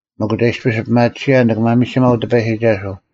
ᒥᒄ ᒐ ᐃᔅᐱᔅ ᐱᒪᑎᓯᔭᓐ ᓂᑭ ᒪᒥᒋᒪᐤ ᑎᐸᔨᒋᒐᓱᐤ,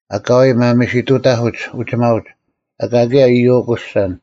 ᐊᑲᐎᔾ ᒪᒥᓯᑐᑕᐧᑯᒡ ᐅᒋᒪᐅᒡ, ᐊᑲ ᑭᔭ ᐃᔪᐤ ᐅᑯᓯᓴᓐ,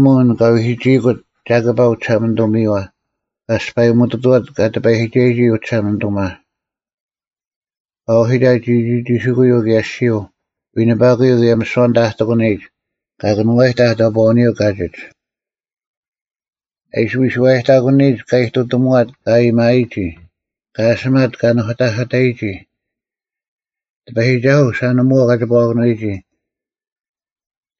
ᒥᔽᔨᒧᐤ ᐊᓐ ᑲ ᐎᒋᐃᑯᑦ ᒐᑭᐸ ᐅᒋᓴᒪᓂᑐᒥᔪᐛ, ᑲ ᐊᔅᐸᔨᒧᑐᑐᐛᑦ ᑲ ᑎᐸᔨᒋᒐᔨᒋ ᐅᒋᓴᒪᓂᑐᒪ; ᑲ ᐅᓯᑕᑦ ᒋᒋᒋᓯᑯᔪᐤ ᑭᔭ ᐊᔅᒋᔪᐤ, ᐎᓂᐸᑯᔪᐤ ᑭᔭ ᒥᓯᐛ ᐊᓐᑕ ᐊ ᑎᒂᓂᔨᒡ: ᑲ ᑭᓄᐛᔨᑕᐧᒃ ᑕᑈᐅᓂᔪᐤ ᑲᒋᒡ; ᐊ ᐃᓯ ᐎᔨᓱᐛᔨᑕᑯᓂᔨᒡ ᑲ ᐃᑐᑎᒧᐛᑦ ᑲ ᐊᔨᒥᐅᔨᒋ; ᑲ ᐊᓴᒪᑦ ᑲ ᓄᑕᐧᑭᑕᔨᒋ᙮ ᑎᐸᔨᒋᒐᓱᐤ, ᓴᓂᒧᐛᐤ ᑲᒋᐸᐛᑭᓄᐎᒋ: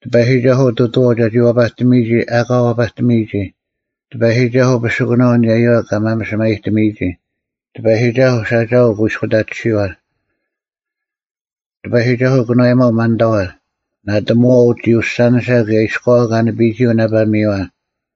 ᑎᐸᔨᒋᒐᓱᐤ ᑐᑐᐛᐤ ᒐᒋ ᐛᐸᑎᒥᔨᒋ ᐊᑲ ᐛᐸᑎᒥᔨᒋ: ᑎᐸᔨᒋᒐᓱᐤ ᐱᓯᑯᓇᐤ ᐊᓂᔭᔪᐛ ᑲ ᒪᒥᓴᒪᔨᑎᒥᔨᒋ: ᑎᐸᔨᒋᒐᓱᐤ ᓴᒋᐊᐤ ᐅᑯᐃᔅᑯᑕᑎᓯᐛ: ᑎᐸᔨᒋᒐᓱᐤ ᑭᓄᐛᔨᒪᐤ ᒪᓐᑕᐛ: ᓇᑎᒧᐛᐤ ᒋᐅᓴᓂᓴ ᑭᔭ ᐃᔎᐛ ᑲ ᓂᐱᔨᒋ ᐅᓇᐸᒥᔪᐛ: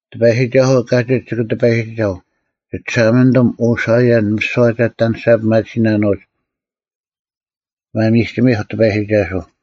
ᑎᐸᔨᒋᒐᓱᐤ ᑲᒋᒡ ᒋᑭ ᑎᐸᔨᒋᒐᐤ, ᒋᒋᓴᒪᓂᑐᒻ, ᐅ ᓴᐃᔭᓐ, ᒥᓯᐛ ᒐ ᐊᑎ ᐊᓂᔅᒐ ᐱᒪᑎᓯᓇᓄᐅᒡ᙮ ᒪᒥᒋᒥᐧᒄ ᑎᐸᔨᒋᒐᓱᐤ!